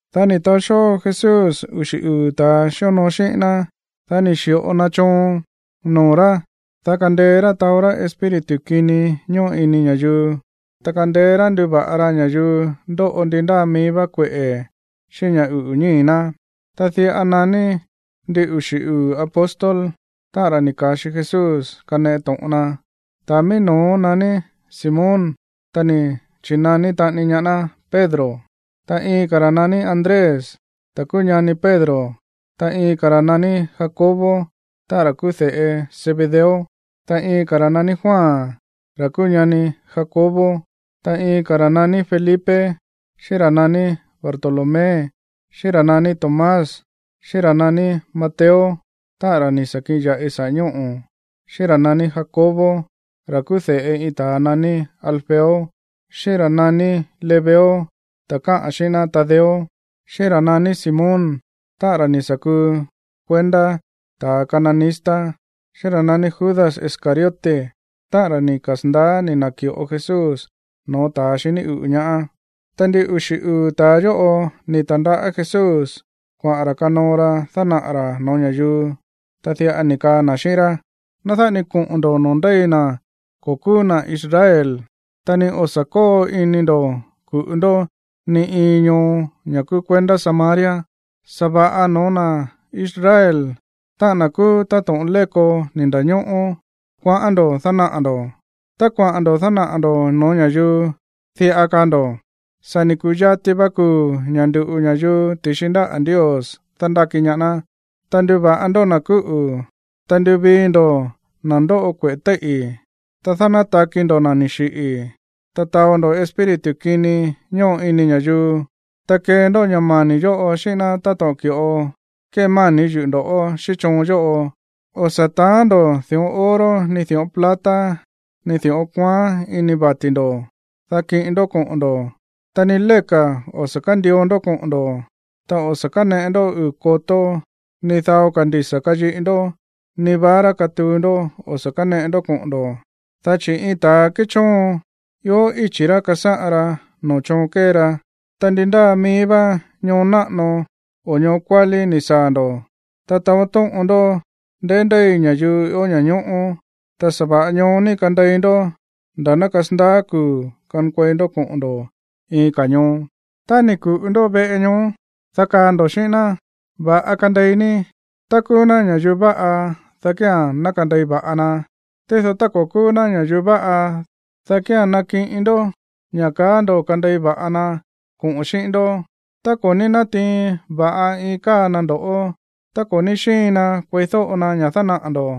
Dá ni̱ taó xóo Jesús uxi̱ uu̱ ta̱a xíonoo xíꞌín ná, dá ni̱ xi̱ꞌo na choon noo̱ rá, dá kandeé rá taó rá espíritu kini ñóꞌo ini ña̱yuu, ta kandeé rá nduva̱ꞌa ra ña̱yuu ndóꞌo ndi ndáa mií vá kueꞌe̱ xíꞌín ña̱ uꞌu̱ ñíi̱ ná. Ta diꞌa naní ndin uxi̱ uu̱ apóstol, táꞌa̱n ra̱ ni̱ ka̱xi Jesús kaneꞌe to̱ꞌon na. Ta̱a mií no̱ó naní Simón, ta ni̱ chi̱naní taꞌani ñaá ná Pedro, ta iin ka̱ ra̱ naní Andrés, ta̱ kúú ñani Pedro, ta iin ka̱ ra̱ naní Jacobo, táꞌa̱n ra̱ kúú de̱ꞌe Zebedeo, ta iin ka̱ ra̱ naní Juan, ra̱ kúú ñani Jacobo. Ta iin ka̱ ra̱ naní Felipe, xíꞌín ra̱ naní Bartolomé, xíꞌín ra̱ naní Tomás, xíꞌín ra̱ naní Mateo, táꞌa̱n ra̱ ni̱ sa̱ kiꞌin ya̱ꞌi saꞌa̱ ñóꞌo̱, xíꞌín ra̱ naní Jacobo, ra̱ kúú de̱ꞌe iin ta̱a naní Alfeo, xíꞌín ra̱ naní Lebeo, ta̱ káꞌa̱n xíꞌín ná Tadeo, xíꞌín ra̱ naní Simón, táꞌa̱n ra̱ ni̱ sa̱ kuu kuendá ta̱ cananista, xíꞌín ra̱ naní Judas Iscariote, táꞌa̱n ra̱ ni̱ kasa̱ndaá ni̱ na̱ki̱ꞌo Jesús no̱ó ta̱ xiní uꞌu̱ ñaá. Ta ndin uxi̱ uu̱ ta̱a yóꞌo ni̱ ta̱ndaꞌá Jesús kuaꞌa̱n ra̱ kanoo ra dánaꞌa̱ ra̱ no̱ó ña̱yuu, ta diꞌa ni̱ kaa na̱ xíꞌín rá: ―Ná dáꞌa ni koꞌo̱n ndo̱ noo̱ ndéi na̱ ko̱ kúú na̱ Israel, ta ni o̱ sa̱ kóo ini ndo̱ ku̱ꞌu ndó ni iin ñoo, ña̱ kúú kuendá Samaria. Sa̱va̱ꞌa no̱ó na̱ Israel, táꞌa̱n na̱ kúú táto̱ꞌon léko ni̱ nda̱ñóꞌó, kuaꞌán ndo̱ dánaꞌa̱ ndo̱. Tá kuaꞌa̱n ndo̱ dánaꞌa̱ ndo̱ no̱ó ña̱yuu, diꞌa kaa ndo̱: “Sa̱ ni̱ ku̱yati va kuu̱ ña̱ ndu̱ꞌu ña̱yuu ti̱xi ndáꞌa̱ Ndios dándáki ñaá ná.” Ta nduva̱ꞌa ndó na̱ kúꞌu̱, ta nduvii ndó na̱ ndóꞌo kueꞌe̱ téíꞌi̱, ta dánátaki ndo̱ na̱ ni̱ xiꞌi̱, ta taó ndó espíritu kini ñóꞌo ini ña̱yuu. Ta kee ndó ña̱ mani̱ yóꞌo xíꞌín ná táto̱ꞌon ki̱ꞌo kémani̱ yuꞌu̱ ndo̱ꞌó xíꞌín choon yóꞌo. ’O̱ sa̱ taán ndo̱ di̱ꞌón oro ni di̱ꞌón plata ni di̱ꞌón kuaán ini vati̱ ndo̱, dá kiꞌin ndó koꞌo̱n ndo̱. Ta ni léka̱ o̱ sa̱ kándio ndó koꞌo̱n ndo̱, ta o̱ sa̱ káneꞌe ndó uu̱ kotó, ni dao ka̱ ndisa̱ kayiꞌi ndó, ni vara katuu ndó o̱ sa̱ káneꞌe ndó koꞌo̱n ndo̱, dá chi̱ iin ta̱ kéchóon, ió íchi̱ ra̱ kasáꞌan ra noo̱ choon kée ra. ’Ta ndi ndáa mií vá ñoo náꞌano o ñoo kuálí ni̱ saa̱ ndo̱, ta taó tóꞌon ndó ndeí ndéi ña̱yuu ió ña̱ñóꞌó, ta sa̱va̱ꞌa ñoó ní kandei ndó nda̱ ná kasandaá kuu̱ kankuei ndó koꞌo̱n ndo̱ iin ka̱ ñoo. Tá ni̱ ku̱ꞌu ndó veꞌe ñoó, dá kaa ndo̱ xíꞌín ná, “Va̱ꞌa kandei ní.” Tá kúú ná ña̱yuu va̱ꞌa, dá kía̱n ná kandei va̱ꞌa na. Tído tá ko̱ kúú ná ña̱yuu váꞌa, dá kía̱n nakiꞌin ndó ña̱ kaá ndo̱ kandei va̱ꞌa na koꞌa̱n xíꞌín ndó. Tá ko̱ ní nátiin va̱ꞌa iin káa na ndo̱ꞌó, ta ko̱ ní xíin na kueídóꞌo na ña̱ dánaꞌa̱ ndo̱,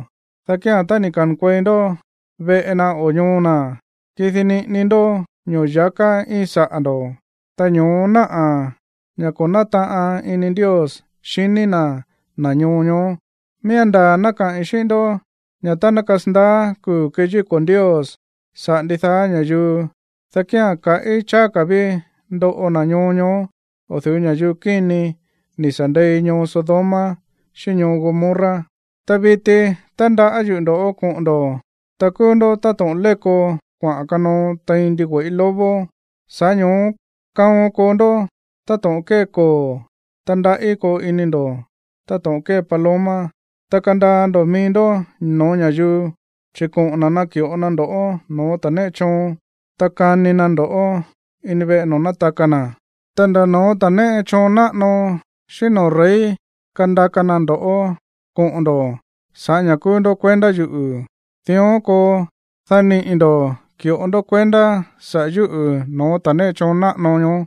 dá kía̱n tá ni̱ ka̱nkuei ndó veꞌe na o ñoo na̱, kidi niꞌini ndó ño̱ya̱ká íin saꞌa̱ ndo̱, ta ño̱ó náꞌa̱ ña̱ ko̱ nátaꞌan ini Ndios xiní na̱ na̱ ñoo ñoó. Miía̱n ndaa̱ ná kaꞌi̱n xíꞌín ndó ña̱ tá ná kasandaá kuu̱ keyíko̱ Ndios saꞌa̱ ndidaá ña̱yuu, dá kía̱n kaꞌí cháá ka̱ ví ndoꞌo na̱ ñoo ñoó o̱ du̱ú ña̱yuu kíni ni̱ sa̱ ndei ñoo Sodoma xíꞌín ñoo Gomorra. ’Ta viti, tándaꞌá yuꞌu̱ ndo̱ꞌó koꞌo̱n ndo̱, ta kúú ndó táto̱ꞌon léko kuaꞌa̱n kanoo tein ndigüe̱ꞌí lobo. Sa̱ꞌá ño̱ó kaon koo ndó táto̱ꞌon kée koo̱. Ta ndaꞌí koo ini ndo̱ táto̱ꞌon kée paloma. Ta kandaa ndo̱ mií ndó no̱ó ña̱yuu, chi̱ koꞌo̱n na̱ naki̱ꞌo na ndo̱ꞌó no̱ó ta̱ néꞌe choon. Ta kani na ndo̱ꞌó ini veꞌe no̱ó nátaka na̱. Ta nda̱ no̱ó ta̱ néꞌe choon náꞌano xíꞌín no̱ó rey kandaka na ndo̱ꞌó koꞌo̱n ndo̱ sa̱ꞌá ña̱ kúú ndó kuendá yuꞌu̱. Dión koo, dá niꞌi̱ ndo̱ ki̱ꞌo ndó kuendá saꞌa̱ yúꞌu̱ no̱ó ta̱ néꞌe choon náꞌano ñoó,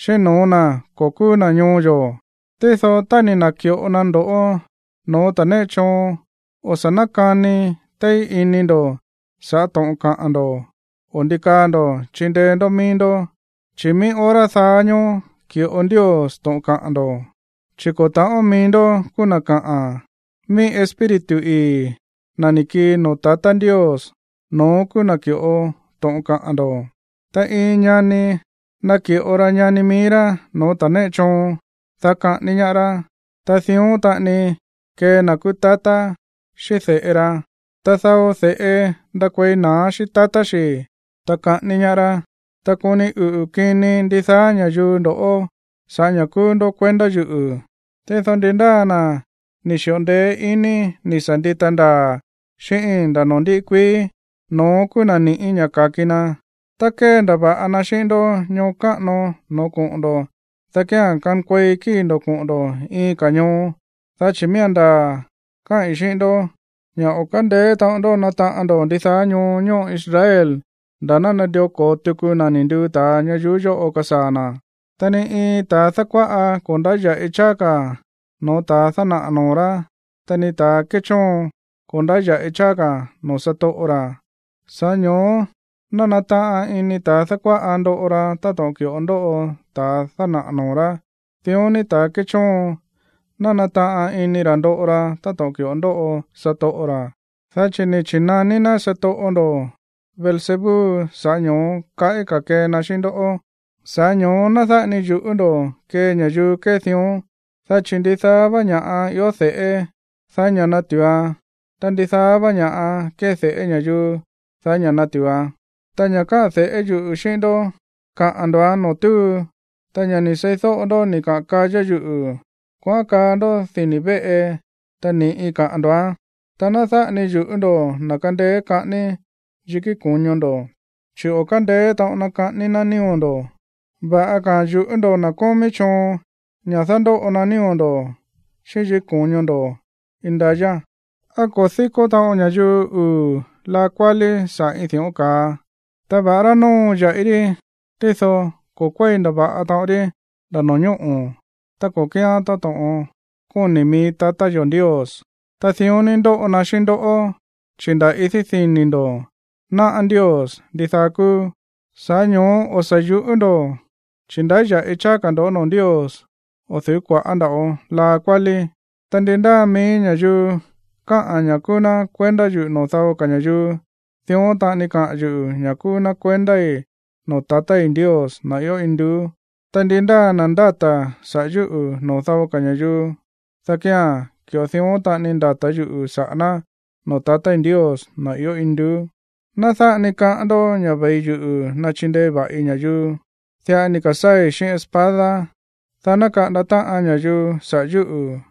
xíꞌín no̱ó na̱ ko̱ kúú na̱ ñoo yo̱. Tído tá ni̱ na̱ki̱ꞌo na ndo̱ꞌó no̱ó ta̱ néꞌe choon, o̱ sa̱ nákani téí ini ndo̱ sa̱ꞌá to̱ꞌon kaꞌa̱n ndo̱ o ndi kaa ndo̱ chindeé ndó mií ndó, chi̱ mií hora daá ñóó ki̱ꞌo Ndios to̱ꞌon kaꞌa̱n ndo̱. Chi̱ ko̱ ta̱ꞌón mií ndó kúú na̱ kaꞌa̱n, mií Espíritu ii̱, na̱ ni̱ kii noo̱ tatá Ndios, no̱ón kúú na̱ ki̱ꞌo to̱ꞌon kaꞌa̱n ndo̱. ’Ta iin ñani naki̱ꞌo ra ñani mií rá no̱ó ta̱ néꞌe choon, dá kaꞌání ñáá rá. Ta dión taꞌani kee na̱ kúú tatá xíꞌín de̱ꞌe ra. Ta dao de̱ꞌe ndakuei na̱á xíꞌín tatá xi̱, ta kaꞌání ñaá rá. Ta koni uꞌu̱ kini ndidaá ña̱yuu ndo̱ꞌó sa̱ꞌá ña̱ kúú ndó kuendá yuꞌu̱. Tído ndi ndáa na̱ ni̱ xi̱ꞌo ndeé iní ni̱ sa̱ ndita ndaa̱ xíꞌíín nda̱ no̱ó ndíꞌí kuií, no̱ón kúú na̱ ni̱ꞌí ña̱ ka̱ki na. Tá kéndava̱ꞌa na xíꞌín ndó ñoo káꞌano no̱ó koꞌo̱n ndo̱, dá kía̱n kankuei kíi̱ ndo̱ koꞌo̱n ndo̱ iin ka̱ ñoo. Dá chi̱ miía̱n ndaa̱ káꞌi̱n xíꞌín ndó ña̱ o̱ kándeé taꞌon ndó nataꞌan ndo̱ ndidaá ñoo ñóꞌo Israel nda̱ ná nandió ko̱o tuku na̱ ni̱ nduu ta̱a ñayuú yóꞌo kasaa̱ na̱. ’Ta ni iin ta̱ dákuáꞌa ko̱ ndáya̱ꞌi cháá ka̱ no̱ó ta̱ dánaꞌa̱ noo̱ rá, ta ni ta̱ kéchóon, ko̱ ndáya̱ꞌi cháá ka̱ noo̱ satoꞌo ra̱. Sa̱ꞌá ño̱ó ná nataꞌan ini ta̱ dákuáꞌa ndoꞌo ra táto̱ꞌon ki̱ꞌo ndóꞌo ta̱a dánaꞌa̱ noo̱ rá, dión ní, ta̱ kéchóon, ná nataꞌan ini ra̱ ndoꞌo ra táto̱ꞌon ki̱ꞌo ndóꞌo satoꞌo ra̱. Dá chi̱ ni̱ chi̱naní ná satoꞌo ndo̱, Beelzebú, sa̱ꞌá ño̱ó kaꞌí ka̱ kee na xíꞌín ndoꞌó. ’Sa̱ꞌá ño̱ó ná dáꞌa ni yu̱ꞌú ndo̱ kee ña̱yuu kée dión, dá chi̱ ndidaá vá ña̱ꞌa ió de̱ꞌé, daí ña̱ natu̱uan. Ta ndidaá vá ña̱ꞌa kéde̱ꞌé ña̱yuu, daí ña̱ natu̱uan. Ta ña̱ káꞌa̱n de̱ꞌé yuꞌu̱ xíꞌín ndó, kaꞌa̱n ndo̱án noo̱ túu, ta ña̱ ni̱ seídóꞌo ndó ni̱ kaꞌa̱n kayá yuꞌu̱, kuaꞌán kaa ndó dini̱ véꞌe, ta ni̱ꞌi kaꞌa̱n ndo̱án. Ta ná dáꞌa ni yu̱ꞌú ndo̱ na̱ kándéé kaꞌání yikí ko̱ño ndo̱, chi̱ o̱ kándeé taꞌon na kaꞌání na̱ nío̱ ndo̱. Va̱ꞌa ka̱a̱n yu̱ꞌú ndo̱ na̱ kómí choon ña̱ dándóꞌo na nío̱ ndo̱ xíꞌín yikí ko̱ño ndo̱ indayá. ’¿Á ko̱ díkó taꞌon ña̱yuu uu̱ laa kuálí saꞌa̱ iin di̱ꞌón ka̱a? Ta va̱ꞌará nóo ya̱ꞌi rí, tído ko̱ kuéi ndava̱ꞌa taꞌon rí nda̱ no̱ñóꞌo̱ tá ko̱ kíán táto̱ꞌon kóni̱ mií tatá yo̱ Ndios. Ta dión ní ndóꞌo na xíꞌín ndoꞌó, chi̱ nda̱ idí dini̱ ndo̱, náꞌá Ndios ndidaá kúú. Sa̱ꞌá ño̱ó o̱ sa̱ yu̱ꞌú ndo̱, chi̱ ndáya̱ꞌi cháá ka̱ ndo̱ noo̱ Ndios o̱ du̱ú kua̱ꞌá nda̱ꞌo laa kuálí. ’Ta ndi ndáa mií ña̱yuu káꞌa̱n ña̱ kúú ná kuendá yuꞌu̱ noo̱ dao ka̱ ña̱yuu, dión taꞌani kaꞌa̱n yuꞌu̱ ña̱ kúú ná kuendái̱ noo̱ tatái̱ Ndios, na̱ ió induú. Ta ndi ndáa na̱ ndáta̱ saꞌa̱ yúꞌu̱ noo̱ dao ka̱ ña̱yuu, dá kía̱n ki̱ꞌo dión taꞌani ndata̱ yuꞌu̱ saꞌa̱ ná noo̱ tatái̱ Ndios, na̱ ió induú. ’Ná dáꞌa ni kaꞌán ndoꞌó ña̱ ve̱i yuꞌu̱ nachindei va̱ꞌi ña̱yuu. Diꞌa ni̱ ka̱sáa̱i̱ xíꞌín espada, dá ná kaꞌanda táꞌan ña̱yuu saꞌa̱ yúꞌu̱.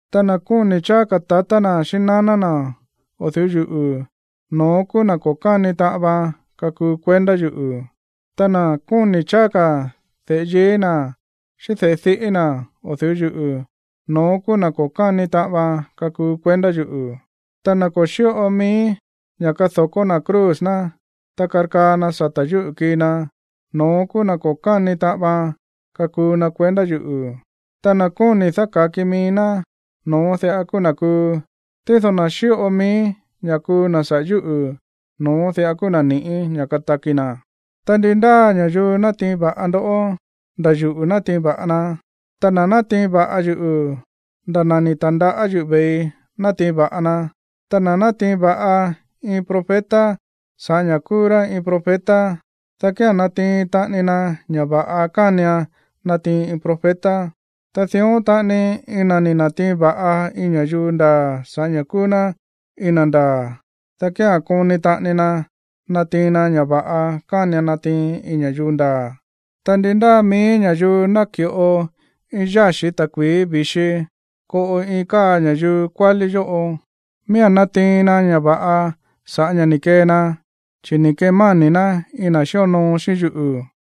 Ta na̱ kóni̱ cháá ka̱ tatá na̱ xíꞌín naná na̱ o̱ du̱ú yuꞌu̱, no̱ón kúú na̱ ko̱ káni taꞌan vaan kakuu kuendá yuꞌu̱. Ta na̱ kóni̱ cháá ka̱ de̱ꞌe yií na̱ xíꞌín de̱ꞌe diꞌí na̱ o̱ du̱ú yuꞌu̱, no̱ón kúú na̱ ko̱ káni taꞌan vaan kakuu kuendá yuꞌu̱. Ta na̱ ko̱ xíꞌo mií ña̱ kado̱kó na̱ cruz ná, ta karkaa na sata̱ yúꞌu̱ kii na, no̱ón kúú na̱ ko̱ káni taꞌan vaan kakuu na kuendá yuꞌu̱. Ta na̱ kóni̱ dáka̱ki mií ná, no̱ón diꞌa kúú na̱ kuu. Tído na̱ xíꞌo mií ña̱ kuu na̱ saꞌa̱ yúꞌu̱, no̱ón diꞌa kúú na̱ ni̱ꞌí ña̱ kataki na̱. ’Ta ndi ndáa ña̱yuu nátiin va̱ꞌa ndoꞌó, nda̱ yuꞌu̱ nátiin va̱ꞌa na. Ta na̱ nátiin va̱ꞌa yuꞌu̱, nda̱ na̱ ni̱ ta̱ndaꞌá yuꞌu̱ ve̱ii nátiin va̱ꞌa na. Ta na̱ nátiin va̱ꞌa iin profeta sa̱ꞌá ña̱ kúú ná iin profeta, dá kía̱n natiin taꞌani na ña̱ va̱ꞌa kánian natiin iin profeta. Ta dión taꞌani, iin na̱ ni̱ na̱tiin va̱ꞌa iin ña̱yuu ndaa̱ sa̱ꞌá ña̱ kúú ná iin na̱ ndaa̱, dá kía̱n koni taꞌani na natiin na ña̱ va̱ꞌa kánian natiin iin ña̱yuu ndaa̱. Ta ndi ndáa mií ña̱yuu náki̱ꞌo iin yáxi̱ ta̱kui̱í vi̱xi koꞌo iin káa ña̱yuu kuálí yóꞌo, miía̱n natiin na ña̱ va̱ꞌa sa̱ꞌá ña̱ ni̱ kee na, chi̱ ni̱ kemáni̱ ná iin na̱ xíonoo xíꞌín yuꞌu̱.